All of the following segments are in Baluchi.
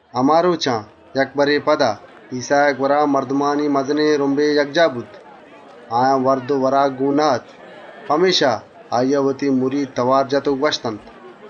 ‏ هما رۆچان، یک بَرے پدا ایسّائے گوَرا مردمانی مزنێن رُمبے یکجاه بوت. آیان وَرد و وراک گۆن نه‌اَت. پمێشکا، آییا وتی مرید لۆٹت و گوَشتنت: ‏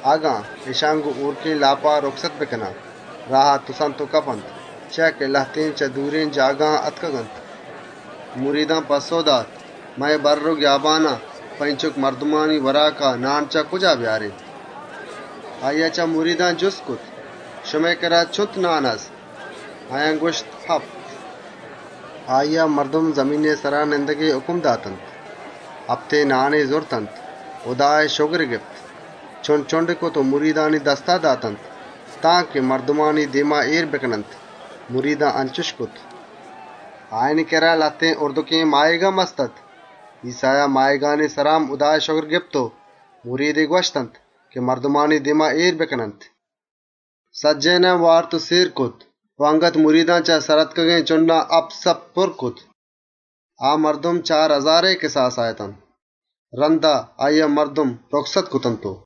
اگن اِشان گۆن شدیگێن لاپا رُکست بکنان، راها تُسنت و کپنت، چیا که لهتێن چه دورێن جاگهان آتکگ.» ‏ مریدان پَسّئو دات: «اے بَرّ و گیابانا په اینچُک مردمئے وراکا، نان چه کجا بیارێن؟» ‏ آییا چه مریدان جُست کرت: «شمارا چُنت نان گۆن؟» گوَشتِش: «هپت.» ‏ آییا مردم زمینئے سرا نندگئے هُکم داتنت، هپتێن نانی زرتنت، هُدائے شگری گپت، چُنڈ چُنڈی کرت و مریدانی دستا داتنت، تانکه مردمانی دێما اێر بکننت. مریدان انچُش کرت. ‏ آیانی کِرّا لهتێن هُردێن ماهیگ هم هست‌اَت. ایسّایا ماهیگانی سرا هم هُدائے شگر گپت و گۆن مریدان گوَشتی که مردمانی دێما اێر بکننت. ‏ سجّهێنان سێرا وارت و رندا چه سر آتکگێن چُنڈان، مریدان هپت سَپْت پُرّ کرت. ‏ آ مردم چار هزارئے کِساسا اتنت. رَندا آییا مردم رُکست کرتنت و ‏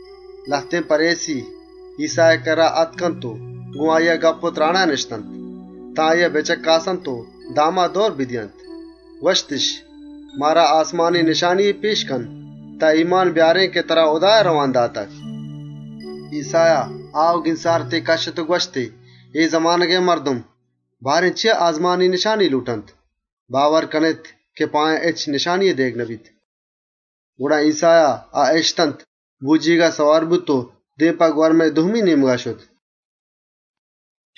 لهتێن پَریسی ایسّائے کِرّا آتک و گۆن آییا گپّ و تْرانا نِشت، تان آییا بچَکّاسنت و داما دئور بدئینت. گوَشتِش: «مارا آسمانی نشانیے پێش کن تان باور کنێن که ترا هُدایا رئوان داتگ.» ‏ ایسّایا چه دلا آه و گینسارتے کَشّت و گوَشتی: «اے زمانگئے مردم، چیا آسمانی نشانیَ لۆٹنت؟ باور کنێت که آیان هچ نشانیے دئیگَ نبیت.» ‏ گڑا ایسّایا آ اِشتنت، بۆجیگا سوار بوت و دێم په گوَرمئے دومی نێمگا شت.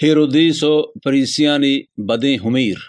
هیرودیس و پَریسیانی بدێن هُمیر ‏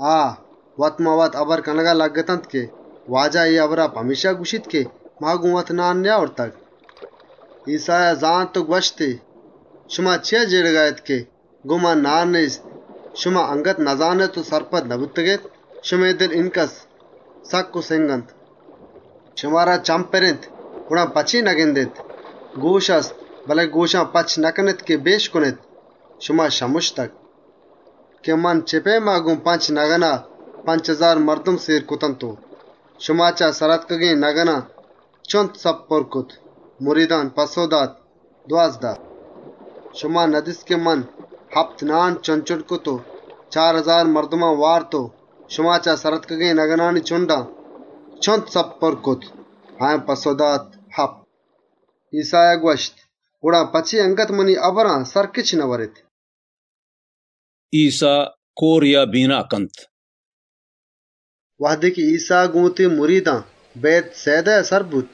آ وت‌مان‌وت هبر کنگا لگِّتنت که: «واجه اے هبرا پمێشکا گوَشیت که ما گۆن وت نان نئیاورتگ.» ‏ ایسّایا زانت و گوَشتی: «چیا جێڑگا اێت که ‹گۆن ما نان نێست›؟ اَنگتَ نزانێت و سرپد نبوتگێت، شمئے دل اینکدر سکّ و سِنگ اَنت؟ ‏ شمارا چمّ پِر اِنت، گڑا په چے نگندێت، گۆش هست، بله گۆشان پَچَ نکنێت که بِشکنێت؟ شما شمُشتگ ‏ من چِه پئیما گۆن پنچ نگنا پنچ هزار مردم سێر کرت و شما چه سر آتکگێن نگنان، چُنت سَپْت پُرّ کرت؟» مریدان پَسّئو دات: «دوازده.» ‏ شما ندیست که من هپت نان چُنڈ چُنڈ کرت و چار هزار مردما وارت و شما چه سر آتکگێن نگنانی چُنڈان، چُنت سَپْت پُرّ کرت؟ آیان پَسّئو دات: «هپت.» ‏ ایسّایا گوَشت: «گڑا په چے اَنگت منی هبران سَرکِچَ نئوَرێت؟» ایسّا کۆرێا بینا کنت ‏ وهدے ایسّا گۆن وتی مریدان بئیت‌سئیدایا سر بوت،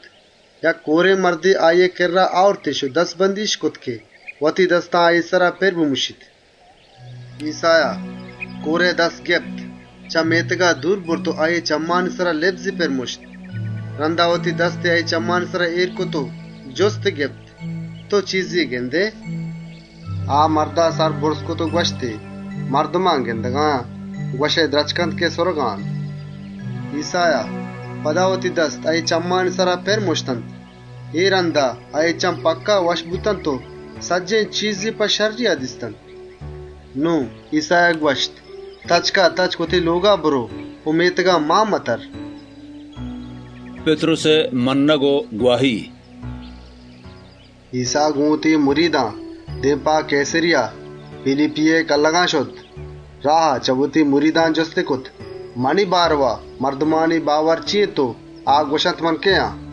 یک کۆرێن مردے آییئے کِرّا آورتِش و دَزبندی‌اِش کرت که وتی دستا آییئے سرا پِر بمُشیت. ‏ ایسّایا کۆرئے دست گپت، چه مێتگا دور برت و آییئے چمّانی سرا لِبزی پِر مُشت. رَندا وتی دستی آییئے چمّانی سرا اێر کرت و جُستی گپت: «تئو چیزے گندئے؟» ‏ آ مردا سر بُرز کرت و گوَشتی: «مردمان گِندگا آن، گوَشئے درچک اَنت که سُرگا اَنت.» ‏ ایسّایا پدا وتی دست آییئے چمّانی سرا پِر مُشتنت، اے رَندا، آییئے چمّ پکّا شَرّ بوتنت و سجّهێن چیزی په شَرّیا دیستنت. ‏ نون ایسّایا گوَشت: «تچکاتچک وتی لۆگا برئو و مێتگا مان متَرّ.» پِتْرُسئے مَنَّگ و گواهی ‏ ایسّا گۆن وتی مریدان دێم په کئیسَریَه پیلیپیئے کلّگان شت. راها، چه وتی مریدان جُستی کرت: «منی بارئوا مردم چے گوَشنت، من کئے آن؟» ‏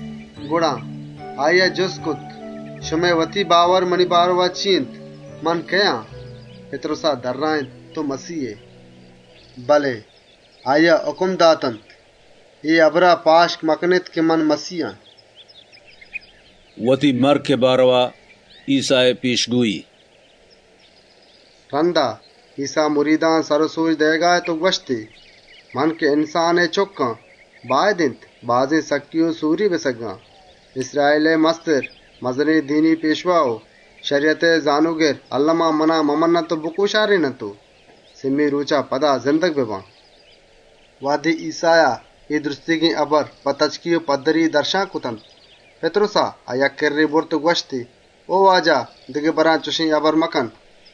گڑا آییا جُست کرت: «شما وت منی بارئوا چے گوَشێت، من کئے آن؟» پِتْرُسا پَسّئو دات: «تئو مَسیه ائے.» ‏ بله آییا هُکم داتنت: «اے هبرا پاشک مکنێت که من مَسیه آن.» وتی مَرکئے بارئوا، ایسّائے ائولی پێشگۆیی ‏ رَندا، ایسّا مریدان سر و سۆج دئیگا اَت و گوَشتی: «انسانئے چُکّ باید اِنت بازێن سکّی و سۆری بسگّیت. کئومئے کماش، مزنێن دینی پێشوا و شَریَتئے زانۆگر اَلّما آییا ممَنّنت و بکۆشارێننت و سئے رۆچا رند پدا زندگ ببیت.» ‏ وهدے ایسّایا اے سجّهێن هبر په تچکی و پَدّری دَرشان کرتنت، پِتْرُسا آ یک کِرّے برت و گوَشتی: «او واجه! دگه برے چُشێن هبر مکن.» ‏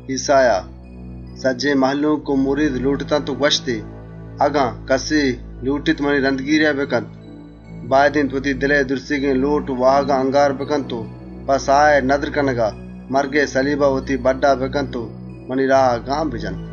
ایسّایا، سجّهێن مهلوک و مرید لۆٹتنت و گوَشتی: «اگن کَسے لۆٹیت منی رَندگیریا بکنت، باید اِنت وتی دلئے سجّهێن لۆٹ و واهگان یله بدنت و په ساهئے نَدر کنگا، وتی جندئے سَلیبا بَڈّا بکنت و منی راها گام بجنت. ‏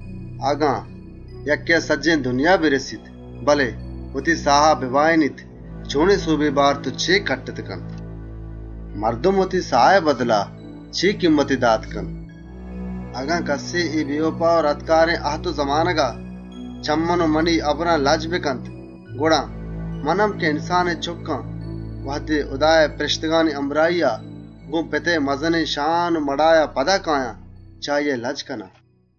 اگن یکّێا سجّهێن دنیا برسیت بله وتی ساها بباهێنیت، چۆنێن سۆبے بارت و چے کَٹّتَ کنت؟ ‏ مردم په وتی ساها چِه کیمّتے داتَ کنت؟ ‏ اگن کَسے اے بێوپا و رَدکارێن اَهد و زمانگا چه من و منی هبران لَجّ بکنت، گڑا انسانئے چُکّ هم، وهدے هُدائے پاکێن پرێشتگانی همراهیا گۆن پتئے مزنێن شان و مڑاها پدا کئیت، چه آییا لَجَّ کنت.»